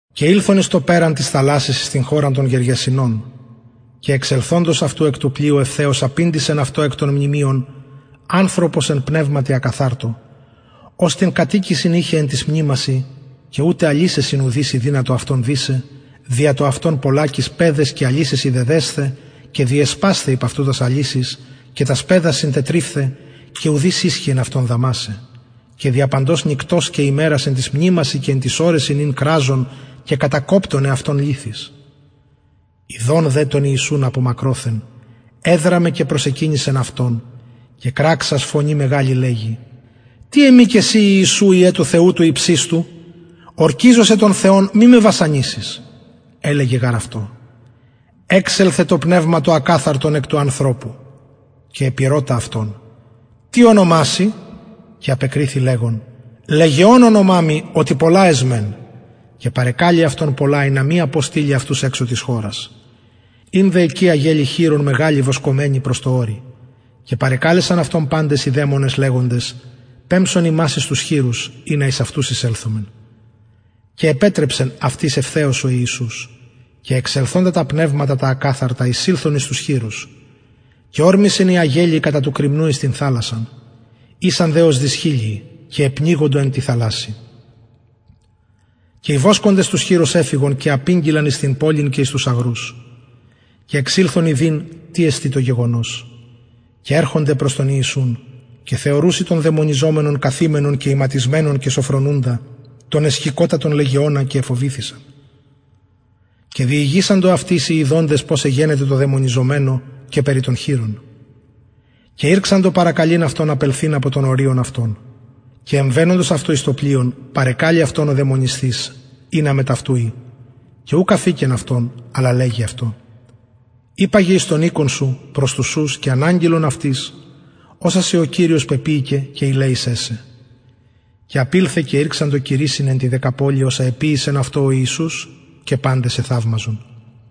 και ηλθον εις το περαν της θαλασσης εις την χωραν των γαδαρηνων και εξελθοντι αυτω εκ του πλοιου ευθεως απηντησεν αυτω εκ των μνημειων ανθρωπος εν πνευματι ακαθαρτω ος την κατοικησιν ειχεν εν τοις μνημασιν και ουτε αλυσεσιν ουδεις εδυνατο αυτον δησαι δια το αυτον πολλακις πεδαις και αλυσεσιν δεδεσθαι και διεσπασθαι υπ αυτου τας αλυσεις και τας πεδας συντετριφθαι και ουδεις αυτον ισχυεν δαμασαι και δια παντος νυκτος και ημερας εν τοις ορεσιν και εν τοις μνημασιν ην κραζων και κατακοπτων εαυτον λιθοις ιδων δε τον ιησουν απο μακροθεν εδραμεν και προσεκυνησεν αυτω και κραξας φωνη μεγαλη ειπεν τι εμοι και σοι ιησου υιε του θεου του υψιστου ορκιζω σε τον θεον μη με βασανισης ελεγεν γαρ αυτω εξελθε το πνευμα το ακαθαρτον εκ του ανθρωπου και επηρωτα αυτον τι σοι ονομα και απεκριθη λεγων λεγεων ονομα μοι οτι πολλοι εσμεν και παρεκαλει αυτον πολλα ινα μη αυτους αποστειλη εξω της χωρας ην δε εκει προς τω ορει αγελη χοιρων μεγαλη βοσκομενη και παρεκαλεσαν αυτον παντες οι δαιμονες λεγοντες πεμψον ημας εις τους χοιρους ινα εις αυτους εισελθωμεν και επετρεψεν αυτοις ευθεως ο ιησους και εξελθοντα τα πνευματα τα ακαθαρτα εισηλθον εις τους χοιρους και ωρμησεν η αγελη κατα του κρημνου εις την θαλασσαν ησαν δε ως δισχιλιοι και επνιγοντο εν τη θαλασση οι δε βοσκοντες τους χοιρους εφυγον και ανηγγειλαν εις την πολιν και εις τους αγρους και εξηλθον ιδειν τι εστιν το γεγονος και ερχονται προς τον ιησουν και θεωρουσιν τον δαιμονιζομενον καθημενον και ιματισμενον και σωφρονουντα τον εσχηκοτα τον λεγεωνα και εφοβηθησαν διηγησαντο δε αυτοις οι ιδοντες πως εγενετο τω δαιμονιζομενω και περι των χοιρων και ηρξαντο παρακαλειν αυτον απελθειν απο των οριων αυτων και εμβαντος αυτου εις το πλοιον παρεκαλει αυτον ο δαιμονισθεις ινα η μετ αυτου ο δε ιησους ουκ αφηκεν αυτον αλλα λεγει αυτω υπαγε εις τον οικον σου προς τους σους και αναγγειλον αυτοις οσα σοι ο κυριος πεποιηκεν και ηλεησεν σε και απηλθεν και ηρξατο κηρυσσειν εν τη δεκαπολει οσα εποιησεν αυτω ο ιησους και παντες εθαυμαζον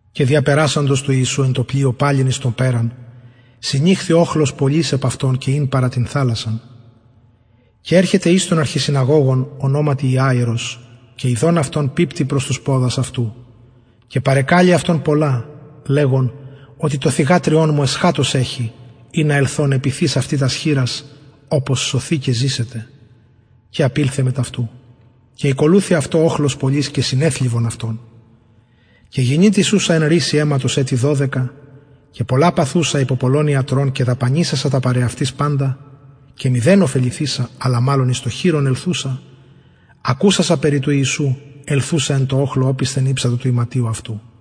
και διαπερασαντος του ιησου εν τω πλοιω παλιν εις το περαν συνηχθη οχλος πολυς επ αυτον και ην παρα την θαλασσαν και ιδου ερχεται εις των αρχισυναγωγων ονοματι ιαειρος και ιδων αυτον πιπτει προς τους ποδας αυτου και παρεκαλει αυτον πολλα λεγων οτι το θυγατριον μου εσχατως εχει ινα ελθων επιθης αυτη τας χειρας οπως σωθη και ζησεται και απηλθεν μετ αυτου και ηκολουθει αυτω οχλος πολυς και συνεθλιβον αυτον και γυνη τις ουσα εν ρυσει αιματος ετη δωδεκα και πολλα παθουσα υπο πολλων ιατρων και δαπανησασα τα παρ αυτης παντα και μηδεν ωφεληθεισα αλλα μαλλον εις το χειρον ελθουσα ακουσασα περι του ιησου ελθουσα εν τω οχλω οπισθεν ηψατο του ιματιου αυτου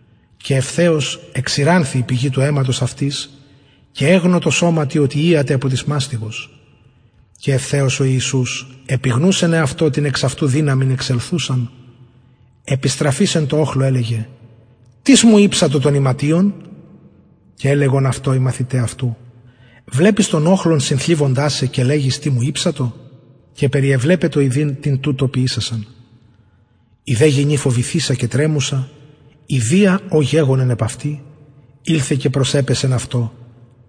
και ευθεως εξηρανθη η πηγη του αιματος αυτης και εγνω τω σωματι οτι ιαται απο της μαστιγος και ευθεως ο ιησους επιγνους εν εαυτω την εξ αυτου δυναμιν εξελθουσαν επιστραφεις εν τω οχλω ελεγεν τις μου ηψατο των ιματιων και ελεγον αυτω οι μαθηται αυτου βλεπεις τον οχλον συνθλιβοντα σε και λεγεις τις μου ηψατο και περιεβλεπετο ιδειν την τουτο ποιησασαν η δε γυνη φοβηθεισα και τρεμουσα ειδυια ο γεγονεν επ αυτη ηλθεν και προσεπεσεν αυτω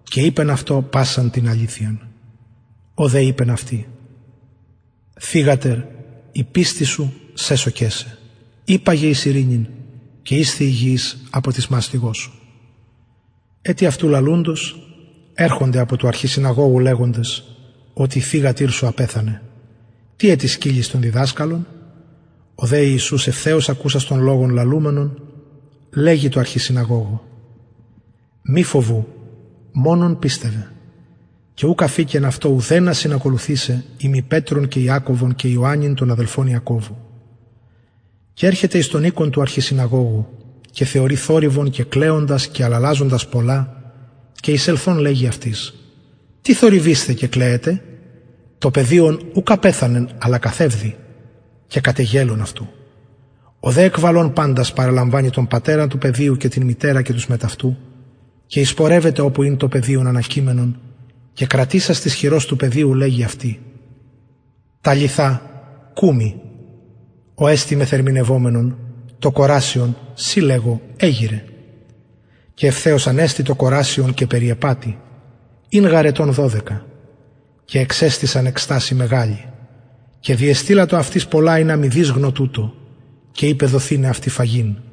και ειπεν αυτω πασαν την αληθειαν ο δε ειπεν αυτη θυγατερ η πιστις σου σεσωκεν σε υπαγε εις ειρηνην και ισθι υγιης απο της μαστιγος σου ετι αυτου λαλουντος ερχονται απο του αρχισυναγωγου λεγοντες οτι η θυγατηρ σου απεθανεν τι ετι σκυλλεις τον διδασκαλον ο δε ιησους ευθεως ακουσας τον λογον λαλουμενον λεγει τω αρχισυναγωγω μη φοβου μονον πιστευε και ουκ αφηκεν ουδενα αυτω συνακολουθησαι ει μη πετρον και ιακωβον και ιωαννην τον αδελφον ιακωβου και ερχεται εις τον οικον του αρχισυναγωγου και θεωρει θορυβον κλαιοντας και αλαλαζοντας πολλα και εισελθων λεγει αυτοις τι θορυβεισθε και κλαιετε το παιδιον ουκ απεθανεν αλλα καθευδει και κατεγελων αυτου ο δε εκβαλων παντας παραλαμβανει τον πατερα του παιδιου και την μητερα και τους μετ αυτου και εισπορευεται οπου ην το παιδιον ανακειμενον και κρατησας της χειρος του παιδιου λεγει αυτη ταλιθα κουμι ο εστιν μεθερμηνευομενον το κορασιον σοι λεγω εγειραι και ευθεως ανεστη το κορασιον και περιεπατει ην γαρ ετων δωδεκα και εξεστησαν εκστασει μεγαλη και διεστειλατο αυτοις πολλα ινα μηδεις γνω τουτο και ειπεν δοθηναι αυτη φαγειν